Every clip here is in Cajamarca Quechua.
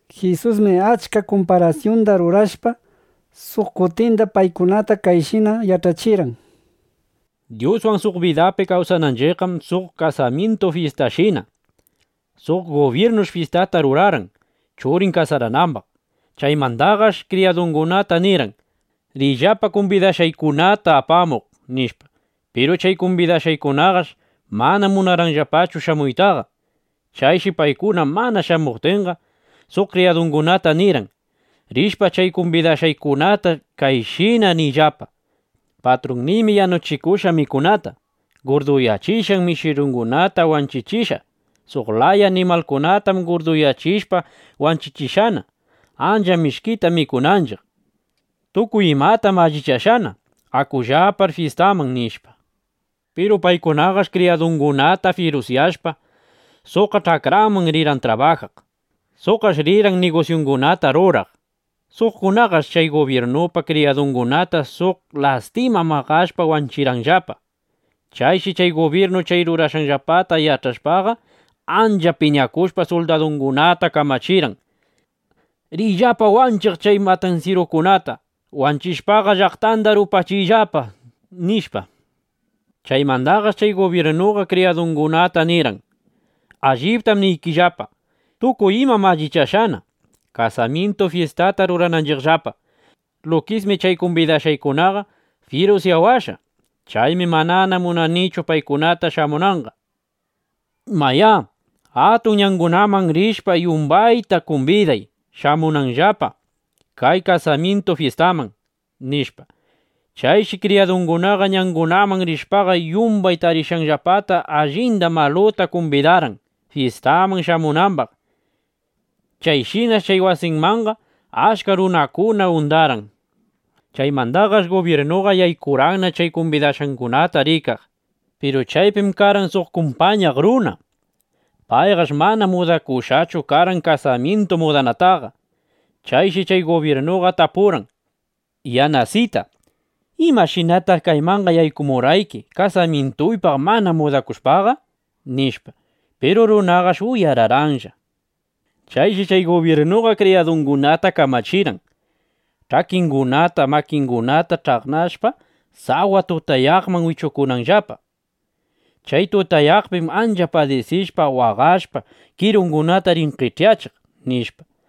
Jisusmi achka kumparasyunda rurashpa, suq kutinda paykunata kayshina yach'achirqan: —Dyuswan suq bidapi kawsananchiqqam suq kasamyintu fyistashina. Suq gubyirnush fyistata rurarqan, churin kasaranambaq. Chaymandaqash kriyadungunata nirqan: “Riyllapa kumbidashqaykunata apamuq”, nishpa. Piru chay kumbidashqangunaqash mana munarqanllapachu shamuytaqa. Chayshi paykuna mana shamuptinqa, suq kriyadungunata nirqan: “Rishpa chay kumbidashqaykunata kayshina niyllapa: ‘Patrunniymi yanuchikushqa mikunata. Gurduyachishqan mishirungunata wanchichishqa. Suq laya animalkunatam gurduyachishpa wanchichishqana, ancha mishkita mikunanchiq. Tukuy imatam allichashqana. Akullapar fyistaman’”, nishpa. Piru paykunaqash kriyadungunata fyirusyashpa, suqqa ch'akranman rirqan trabajaq. Suqqash rirqan nigusyungunata ruraq. Suqkunaqash chay gubyirnupa kriyadungunata suq lastima maqashpa wanchirqanllapa. ’Chayshi chay gubyirnu chay rurashqanllapata yach'ashpaqa, ancha piñakushpa, suldadungunata kamachirqan: “Riyllapa wanchiq chay matansyirukunata. Wanchishpaqa, llaqtanda rupachiyllapa”, nishpa. Chaymandaqash chay gubyirnuqa kriyadungunata nirqan: “Alliptam niykillapa, tukuy imam allichashqana, kasamyintu fyistata rurananchiqllapa. Lukismi chay kumbidashqaykunaqa fyirusyawashqa. Chaymi manana munanichu paykuna shamunanqa. Mayá, atun ñangunaman rishpa, yumbanda kumbiday, shamunanllapa kay kasamyintu fyistaman”, nishpa. Chayshi kriyadunguna ñangunaman rishpaqa, yumbay tarishqanllapata allinda, maluta kumbidarqan, fyistaman shamunambaq. Chayshinash chay wasimanqa achka runakuna undarqan. ’Chaymandaqash gubyirnuqa yaykurqanna chay kumbidashqangunata rikaq. Piru chaypi karqan suq kumpañaq runa. Payqash (chay kasaraqta mana rrispitashpachu) mana mudakushqachu karqan kasamyintu mudanataqa. Chayshi chay gubyirnuqa tapurqan: “Yanasita (Yanasitu), ¿imashinataq kaymanqa yaykumurqayki kasamyintupaq mana mudakushpaqa?” nishpa. Piru runaqash uyararqanlla. Chayshi chay gubyirnuqa kriyadungunata kamachirqan: “Ch'akingunata, makingunata ch'aqnashpa, sawa tutayaqman wichukuyllapa. Chay tutayaqpim ancha padisishpa, waqashpa, kirungunata rin qech'yachiq”, nishpa.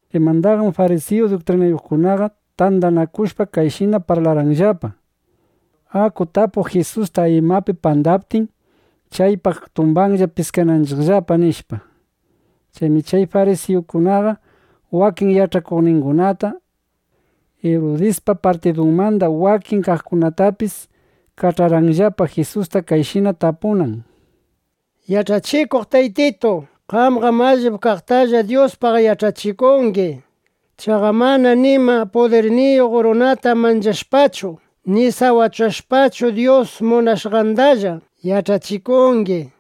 Chaymandaqam farisiyu duktrinayuqkunaqa tandanakushpa, kayshina parlarqanllapa: —Aku tapuq Jisusta, imapi pandaptin, chaypaq tumbanna prisunanchiqllapa, nishpa. Chaymi chay farisiyukunaqa wakin yach'akuqningunata, Irudispa partidunmanda wakin kaqkunatapis kach'arqanllapa, Jisusta kayshina tapunan: —Yach'achikuq Taytitu, qamqam allip kaqtalla Dyuspaq yach'achikungi. Chaqa manam nima pudirniyuq runata manchashpachu ni sawachashpachu, Dyus munashqandalla yach'achikungi.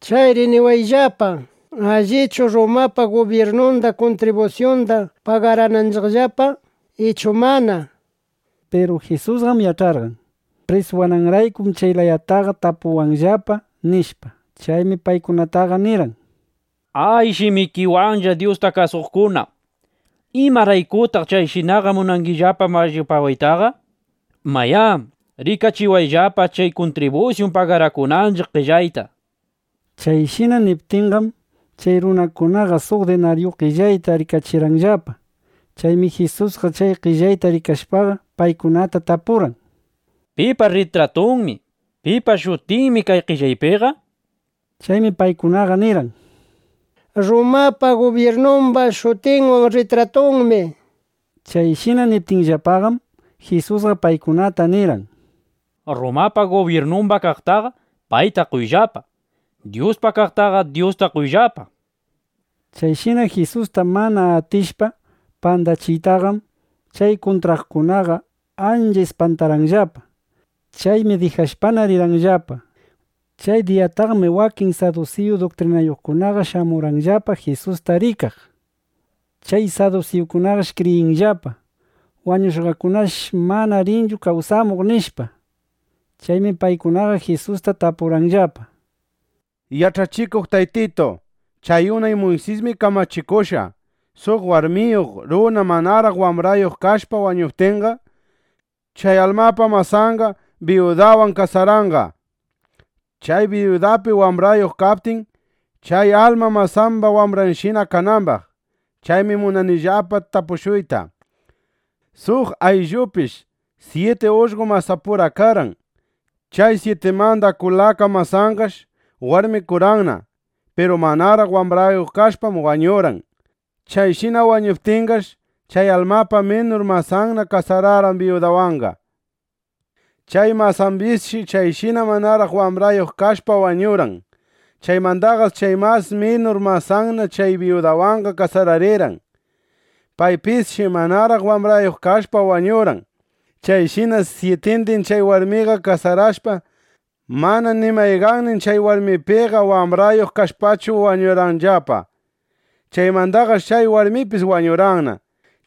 Chayri niwayllapa, ¿Allichu Rrumapa gubyirnunda kuntribusyunda pagarananchiqllapa, ichu mana? nishpa. Piru Jisusqam yach'arqan: Prisuwananraykum chay layataqa tapuwanllapa, nishpa. Chaymi paykunataqa nirqan: —¡A, shimikiwanlla Dyusta kasuqkuna! ¿Imaraykutaq chayshinaqa munangillapa mallipawaytaqa? Mayá, rikachiwayllapa chay kuntribusyun pagarakunanchiq qellayta, nishpa. Chayshina niptinqam, chay runakunaqa suq dinaryu qellayta rikachirqanllapa. Chaymi Jisusqa chay qellayta rikashpaqa, paykunata tapurqan: —¿Pipa rritratunmi, pipa shutinmi kay qellaypiqa? nishpa. Chaymi paykunaqa nirqan: —Rrumapa gubyirnumba shutinwan rritratunmi, nishpa. Chayshina niptinllapaqam, Jisusqa paykunata nirqan: —Rrumapa gubyirnumba kaqtaqa, payta qoyllapa. Dyuspa kaqtaqa Dyusta qoyllapa, nishpa. Chayshina Jisusta mana atishpa pandachiytaqam, chay kuntraqkunaqa ancha ispantarqanllapa. Chaymi dijashpana, rirqanllapa. Chay diyataqmi wakin sadusiyu duktrinayuqkunaqa shamurqanllapa Jisusta rikaq. Chay sadusiyukunaqam kriyinllapa: Wañushqakunaqash manana rinchu kawsamuq, nishpa. Chaymi paykunaqa Jisusta tapurqanllapa: —Yach'achikuq Taytitu, chay unay Muysismi kamachikushqa, suq warmiyuq runa manaraq wambrayuq kashpa wañuptinqa, chay almapa masanna biyudawan kasaranqa, chay biyudapi wambrayuq kaptin, chay alma masamba wambranshina kanambaq. Chaymi munanillapa tapushuyta: Suq ayllupish syiti ullqo masapura karqan. Chay syitimanda kulaka masanqash warmikurqanna. Piru manaraq wambrayuq kashpash wañurqan. Chayshina wañuptinqash, chay almapa minur masanna kasararqan biyudawanqa. Chay masambisshi chayshina manaraq wambrayuq kashpa wañurqan. Chaymandaqash chay mas minur masanna chay biyudawanqa kasararirqan. Paypisshi manaraq wambrayuq kashpa wañurqan. Chayshinash syitindin chay warmiwan kasarashpa, mana ni mayqannin chay warmipiqa wambrayuq kashpachu wañurqanllapa. Chaymandaqash chay warmipis wañurqanna.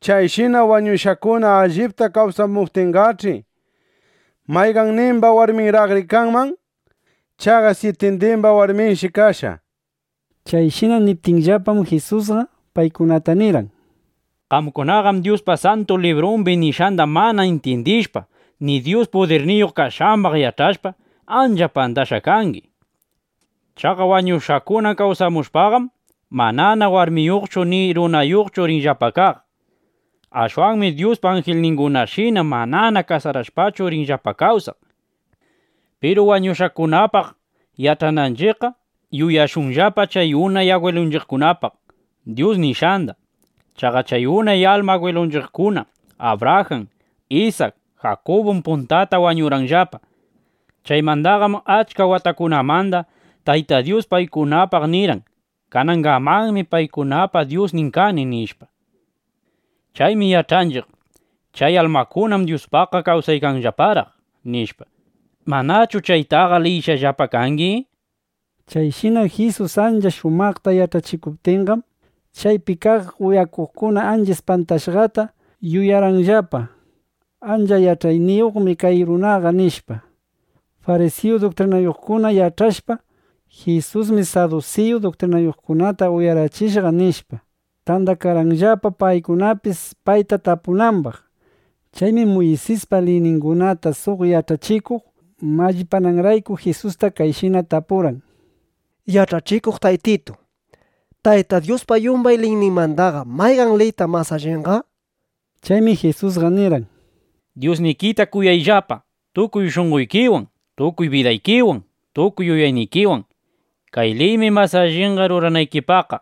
Chayshina wañushqakuna allipta kawsamuptinqach'i, ¿mayqannimba warminraqri kanman? Chaqa syitindimba warminshi kashqa, nishpa. Chayshina niptinllapam, Jisusqa paykunata nirqan: —Qamkunaqam Dyuspa Santu Librun nishqanda mana intyindishpa ni Dyus pudirniyuq kashqambaq yach'ashpa, ancha pandashqa kangi. Chaqa wañushqakuna kawsamushpaqam, manana warmiyuqchu ni runayuqchu rinllapa kaq. Ashwanmi Dyuspa anjilningunashina manana kasarashpachu rinllapa kawsaq. Piru wañushqakunapaq yach'ananchiqqa, yuyashunllapa chay unay agwilunchiqkunapaq Dyus nishqanda. Chaqa chay unay alma agwilunchiqkuna Abrajan, Isak, Jakubum puntata wañurqanllapa. (Chaymandaqam achka watakunamanda) Tayta Dyus paykunapaq nirqan: “Kanangamanmi paykunapa Dyusnin kani”, nishpa. Chaymi yach'anchiq: Chay almakunam Dyuspaqqa kawsaykanllaparaq, nishpa. ¿Manachu chaytaqa liyishqallapa kangi? Chayshina Jisus ancha shumaqta yach'achikuptinqam, chaypi kaq uyaqkuna ancha ispantashqata yuyarqanllapa: Ancha yach'ayniyuqmi kay runaqa, nishpa. Farisiyu duktrinayuqkuna yach'ashpa: Jisusmi sadusiyu duktrinayuqkunata uyarachishqa nishpa, tandakarqanllapa, paykunapis payta tapunambaq. Chaymi Muysispa liyningunata suq yach'achikuq mallipananrayku Jisusta kayshina tapurqan: —Yach'achikuq Taytitu, ¿Tayta Dyuspa yumbay liyninmandaqa mayqan liytaq mas allinqa? nishpa. Chaymi Jisusqa nirqan: —“Dyusnikita kuyayllapa, tukuy shunqoykiwan, tukuy bidaykiwan, tukuy yuyaynikiwan.” Kay liymi mas alli ruranaykipaqqa.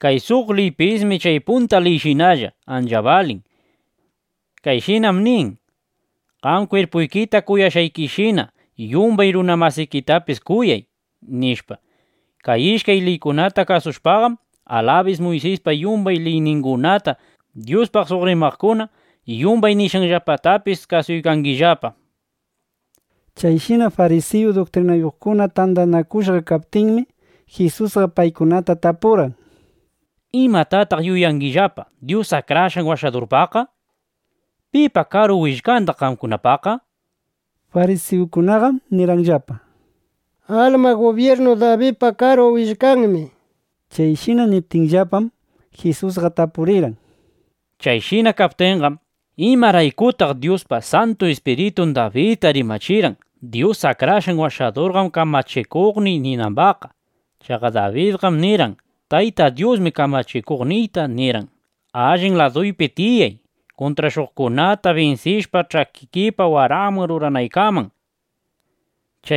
Kay suq liypismi chay punta liyshinalla ancha balin. Kayshinam nin: “Qam kwirpuykita kuyashqaykishina, yumbay runa masikitapis kuyay”, nishpa. Kay ishkay liykunata kasushpaqam, alabis Muysispa yumbay liyningunata, Dyuspaq suq rimaqkuna yumbay nishqanllapatapis kasuykangillapa. Chayshina farisiyu duktrinayuqkuna tandanakushqa kaptinmi, Jisusqa paykunata tapurqan: —¿Imatataq yuyangillapa Dyus Akrashqan Washadurpaqqa? ¿Pipa karu willkandaq qamkunapaqqa? nishpa. Farisiyukunaqam nirqanllapa: —Alma gubyirnu Dabidpa karu willkanmi, nishpa. Chayshina niptinllapam, Jisusqa tapurirqan: —Chayshina kaptinqa, ¿imaraykutaq Dyuspa Santu Ispiritum Dabidta rimachirqan: “Dyus Akrashqan Washadurqam kamachikuqniy”, ninambaqqa? Chaqa Dabidqam nirqan: Tayta Dyusmi Kamachikuqniyta nirqan: “Allin laduypi tiyay, kuntrashuqkunata binsishpa, ch'akikipa waranman ruranaykaman (qamta kasushunanllapa)”, nishpa.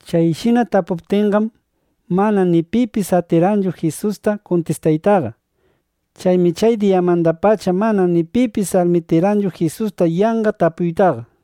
Chayshina tapuptinqam, manana ni pipis atirqanchu Jisusta kuntistaytaqa. Chaymi chay diyamandapacha manana ni pipis almitikarqanchu Jisusta yanqa tapuytaqa.